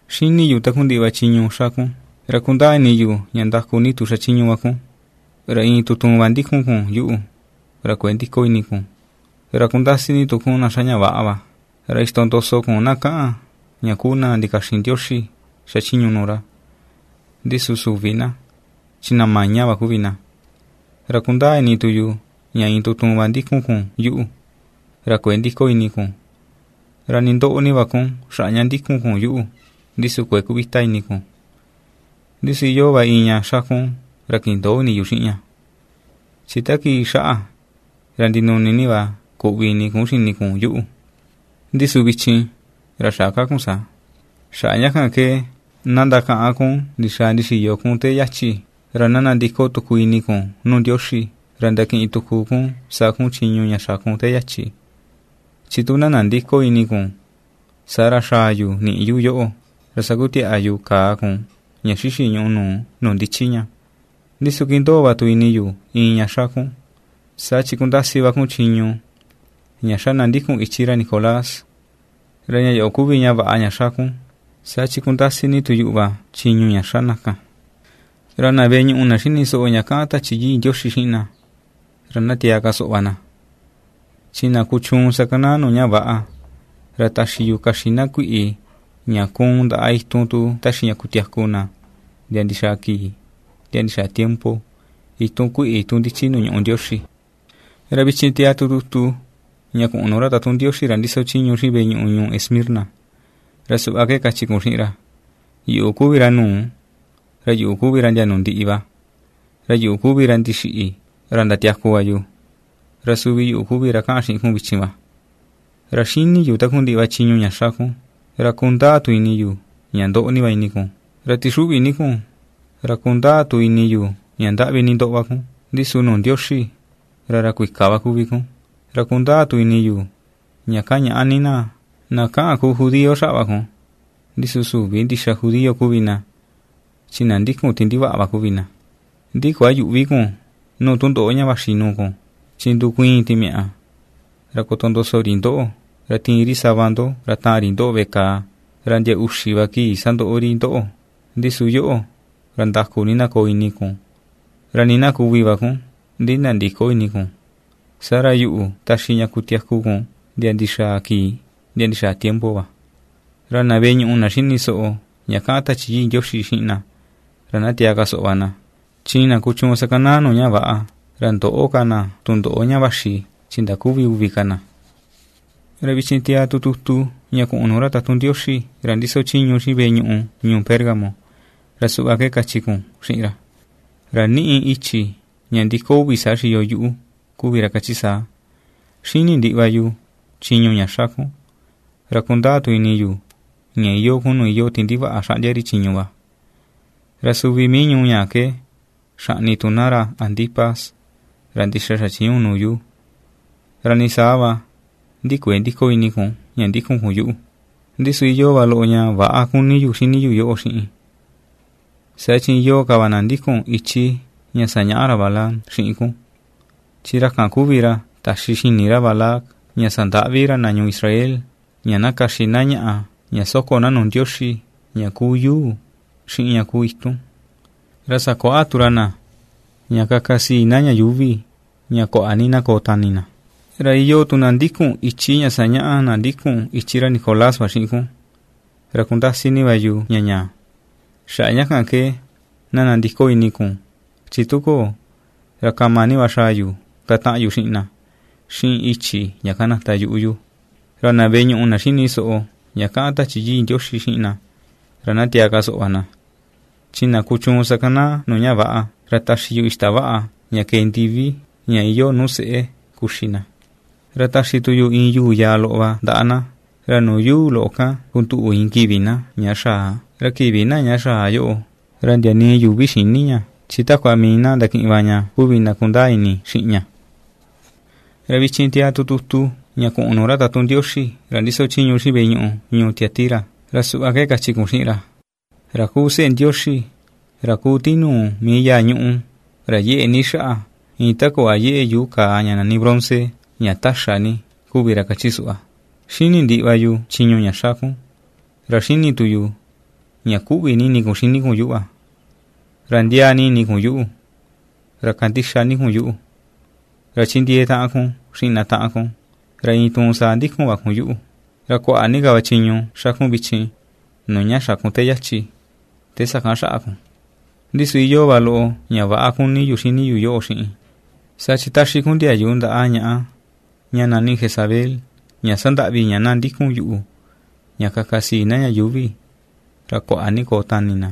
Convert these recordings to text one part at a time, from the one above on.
^Xíni̱ yu takundiꞌi va chiñu ña ^xa kun, ra kundaa ini yu ña ndaku ni tu xachiñu va kun, ra iin tutuun va ndikun kun yuꞌu, ra kuëe ndiko ini kun, ra kundasi ni tu kun na xa ña väꞌa va, ra ixtondoso kun na kaꞌan ña kuu na na ndikaxin Ndioxi xachiñu nuu ra, ndi su süvi na, chi na maña va kuvi na. Ra kundaa ini tu yu ña iin tutuun va ndikun kun yuꞌu, ra kuëe ndiko ini kun, ra nii ndoꞌo ni va kun xaꞌa ña ndikun kun yuꞌu, ndi su kuëe kuvita ini kun. Ndi su iyoo va iin ña xa kun ra kindöo ini yu xiꞌin ña, chi ta kii xaꞌa, ra ndinuni ni va kuꞌvi ini kun xini kun yuꞌu, ndi su vichin, ra xä ka kun saa. Xaꞌa ña kan ke na ndakaꞌan kun ndixaa ndixiyo kun te yachi, ra na nandiko tuku ini kun nuu Ndioxi, ra ndakiꞌin tuku kun sa kun chiñu ña xa kun te yachi. Chi tu na nandïko ini kun, saa ra xaa yu niꞌi yu yoꞌo ra sakutiaꞌa yu kaa kun ña xixi ñùꞌù nuu, nuu ndichi ña. Ndi su ^kindoo va tu ini yu iin ña ^xa kun, saa chi ^kundasi va kun chiñu ña xa na ndikun ichi ra Nicolás, ra ña yoꞌo kuvi ña vaꞌa ña xa kun, saa chi ^kundasi ni tu yuꞌu va chiñu ña xa na kan. Ra na veꞌe ñuꞌu, na xíni soꞌo ña kaꞌan Tachi Yii Ndioxi xiꞌin na, ra na tiaa ka soꞌo va na. Chi na kuchuun sakanaa nuu ña väꞌa, ra taxi yu kaxin na kuiꞌi ña kuun ndaꞌa itun tu taxi ña kutiaku na ndia ndixaa kii ndia ndixaa tiempo, itun kuiꞌi tu ndichi nuu ñuꞌú Ndioxi.” ’Ra vichin tiaa tu tutu ña kuꞌun nuu ra tatun Ndioxi ra ndiso chiñu xiꞌin veꞌe ñuꞌu ñuu Esmirna, ra suꞌva ke kachi kun xiꞌin ra: “Yuꞌu kuvi ra nuu, ra yuꞌu kuvi ra ndia nuu ndiꞌi va, ra yuꞌu kuvi ra ndixiꞌi, ra ndatiaku va yu, ra suvi yuꞌu kuvi ra kaꞌan xiꞌin kun vichin va: Ra xíni̱ yu takundiꞌi va chiñu ña xa kun, ra kundaa tu ini yu ña ^ndoꞌo ni va ini kun, ra ^tixuꞌvi ni kun; ra kundaa tu ini yu ña ndaꞌvi ni ndoꞌo va kun, ndi su nuu Ndioxi ra ra kuika va kuvi kun, ra kundaa tu ini yu ña kañaꞌa ni na, na kaꞌan ku judío xaꞌa va kun, ndi su süvi ndixa judío kuvi na, chi na ndikun ti ndivaꞌa va kuvi na. Ndi kuayüꞌvi kun nuu tundoꞌo ña vaxi nuu kun, chi ndukuiin timiaꞌa ra kotondoso ri ndoꞌo, ra tiin ri sava ndo ra taan ri ndoꞌo veꞌe kàà, ra ndia uxi va kii sandoꞌo ri ndoꞌo. Ndi su yoꞌo, ra ndaku ni na koo ini kun ra nii na kuvi va kun, ndi nandïko ini kun. Saa ra yuꞌu taxi ña kutiaku kun ndia ndixaa kii ndia ndixaa tiempo va. Ra na veꞌe ñuꞌu, na xíni soꞌo ña kaꞌan Tachi Yii Ndioxi xiꞌin na, ra na tiaa ka soꞌo va na. Chi na kuchuun sakanaa nuu ña väꞌa, ra ndöꞌo ka na tundoꞌo ña vaxi chi ndaküvi uvi ka na.” ’Ra vichin tiaa tu tutu ña kuꞌun nuu ra tatun Ndioxi ra ndiso chiñu xiꞌin veꞌe ñuꞌu ñuu Pérgamo, ra suꞌva ke kachi kun xiꞌin ra: “Ra ^niꞌi i̱chi̱ ña ndi̱kó uvi saa xiyo yuꞌu, kuvi ra kachi saa: Xíni̱ ndiꞌi va yu chiñu ña xa kun, ra kundaa tu ini yu ña iyoo kun nuu iyoo ti ndivaꞌa xaꞌndia ri chiñu va, ra suvi mii ñuu ñaa ke xaꞌni tu na ra Antipas, ra ndixa xa̱chiñu nuu yu, ra nii saa va, ndi kuëe ndiko ini kun, ña ndikun kun yuꞌu. Ndi su iyoo va loꞌo ña väꞌa kuni yu xini yu yoꞌo xiꞌin; saa chi iyoo ka va na ndikun ichi ña sañaꞌa ra Balaam xiꞌin kun, chi ra kan kuvi ra taxi xini ra Balac ña sandaꞌvi ra na ñuu Israel, ña na kaxi na ñaꞌa ña ^soko na nuu ndioxi ña kuu yuu xiꞌin ña kuu itun, ra sakuaꞌa tu ra na ña kaka sii na ña yuuvi ña kuaꞌa ni na koo tani na. Ra iyoo tu na ^ndikun ichi ña ^sañaꞌa na ndikun ichi ra Nicolás va xiꞌin kun, ra ^kundasi ni va yu ña ñaa. Xaꞌa ña kan ke na nandiko ini kun, chi tu köo, ra kama ni va xaa yu kataꞌan yu xiꞌin na, xiꞌin i̱chi̱ ña kanata yuꞌu yu. Ra na veꞌe ñuꞌu, na xíni soꞌo ña kaꞌan Tachi Yii Ndioxi xiꞌin na, ra na tiaa ka soꞌo va na, chi na kuchuun sakanaa nuu ña väꞌa ra taxi yu ixtavaꞌa ña kée ndivi ña iyoo nuu se̱ꞌè kuxi na, ra taxi tu yu iin yuu yaa loꞌo va ndaꞌa na, ra nuu yuu loꞌo kan kunduꞌu iin kivi na, ña xaa, ra kivi na ña xaa yoꞌo, ra ndia nii yuvi xïni ña, chi takua mii na ndakiꞌin va ña kuvi na kundaa ini xiꞌin ña.” ’Ra vichin tiaa tu tutu ña kuꞌun nuu ra tatun Ndioxi ra ndiso chiñu xiꞌin veꞌe ñuꞌu ñuu Tiatira. Ra suꞌva ke kachi kun xiꞌin ra: “Ra kuu Seꞌe Ndioxi, ra ku tinuu mii yáa̱ ñùꞌù, ra yeꞌe ni xaꞌa, iin ta kuꞌva yeꞌe yuu kaa ña nani bronce, ña taxa ni, kuvi ra kachi suꞌva: Xíni̱ ndiꞌi va yu chiñu ña xa kun, ra xíni̱ tu yu ña kuꞌvi ni ini kun xini kun yuꞌu, ra ndiaa ni ini kun yuꞌu, ra kandixa ni kun yuꞌu, ra chindiee taꞌan kun xiꞌin na taꞌan kun, ra iin tuun saa ndikun va kun yuꞌu, ra kuaꞌa ni ka va chiñu ^xa kun vichin nuu ña xa̱ kun te yachi, te sakan xaꞌa kun. Ndi su iyoo va loꞌo ña väꞌa kuni yu xini yu yoꞌo xiꞌin. Saa chi ^taxi kun ndiayu ndaꞌa ñaꞌa ña nani Jezabel ña sandaꞌvi ña na ndikun yuꞌu ña kaka sii na ña yuuvi ra kuaꞌa ni koo tani na,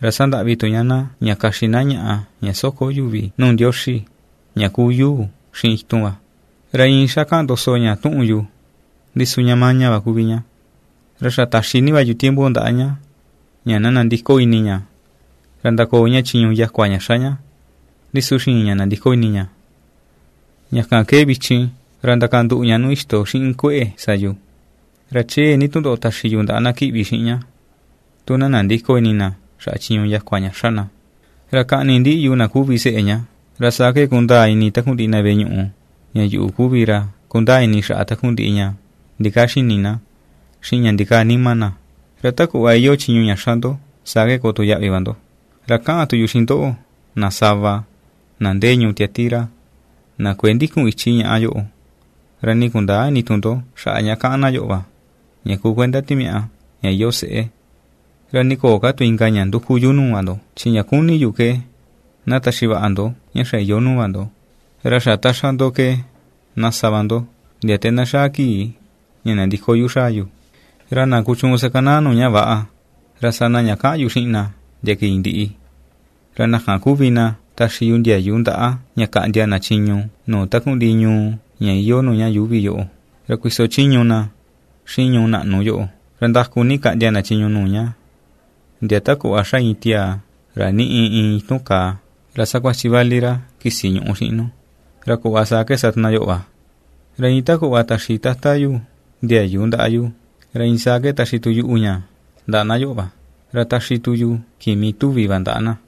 ra sandaꞌvi tu ña na ña kaxi na ñaꞌa ña soko yuvi nuu ndioxi, ña kuu yuu xiꞌin itun va. Ra iin xá kaꞌan ndoso ña tuꞌun yu, ndi su ña maña va kuvi ña. Ra xa ta̱xi ni va yu tiempo ndaꞌa ña, ña na nandiko ini ña, ra ndakoo ña chiñu yakua ña xa ña, ndi su xïin ña nandiko ini ña. Ña kan ke vichin ra ndakanduꞌu ña nuu ixto xiꞌin kueꞌe sa yu. Ra chee ni tundoꞌo taxi yu ndaꞌa na kíꞌvi xiꞌin ña, tu na nandïko ini na xaꞌa chiñu yakua ña xa na. Ra kaꞌni ndiꞌi yu na kuvi seꞌe ña; ra saa ke kundaa ini takundiꞌi na veꞌe ñuꞌu ña yuꞌu kuvi ra kundaa ini xaꞌa takundiꞌi ña ndikaa xini na, xiꞌin ña ndikaa nima na. Ra ta kuꞌva iyoo chiñu ña ^xa ndo saa ke koo tu yaꞌvi va ndo. Ra kaꞌan tu yu xiꞌin ndoꞌo, na sava, na ndee ñuu Tiatira, na kuëe ndikun ichi ñaꞌa yoꞌo, ra nii kundäa ini tu ndo xaꞌa ña kaꞌan na yoꞌo va, ña kuu kuenda timiaꞌa, ña iyoo seꞌé. Ra nii köo ka tu inka ña nduku yu nuu va ndo chi ña ^kuni yu ke ná taxi vaꞌa ndo ña xa iyoo nuu va ndo, ra xa ta ^xa ndo ke, na sa va ndo, ndia te na xaa kii ña nandiko yu xaa yu. Ra na kuchuun sakanaa nuu ña väꞌa, ra sa na ña kaꞌan yu xiꞌin na ndia kii ndiꞌi, ra na kan kuvi na taxi yu ndiayu ndaꞌa ña kaꞌndia na chiñu nuu takundiꞌi ñuu ña iyoo nuu ña yuuvi yoꞌo, ra kuiso chiñu na xiꞌin ñuu naꞌnu yoꞌo, ra ndaku ni kaꞌndia na chiñu nuu ña, ndia ta kuꞌva xa iin tiaa ra niꞌi iin itun kaa, ra sakuachi vali ra kisi ñuꞌu xiꞌin nu, ra kuꞌva saa ke sa tu na yoꞌo va. Ra iin ta kuꞌva taxi Tata yu ndiayu ndaꞌa yu, ra iin saa ke taxi tu yuꞌu ña ndaꞌa na yoꞌo va. Ra taxi tu yu kimi tuvi va ndaꞌa na.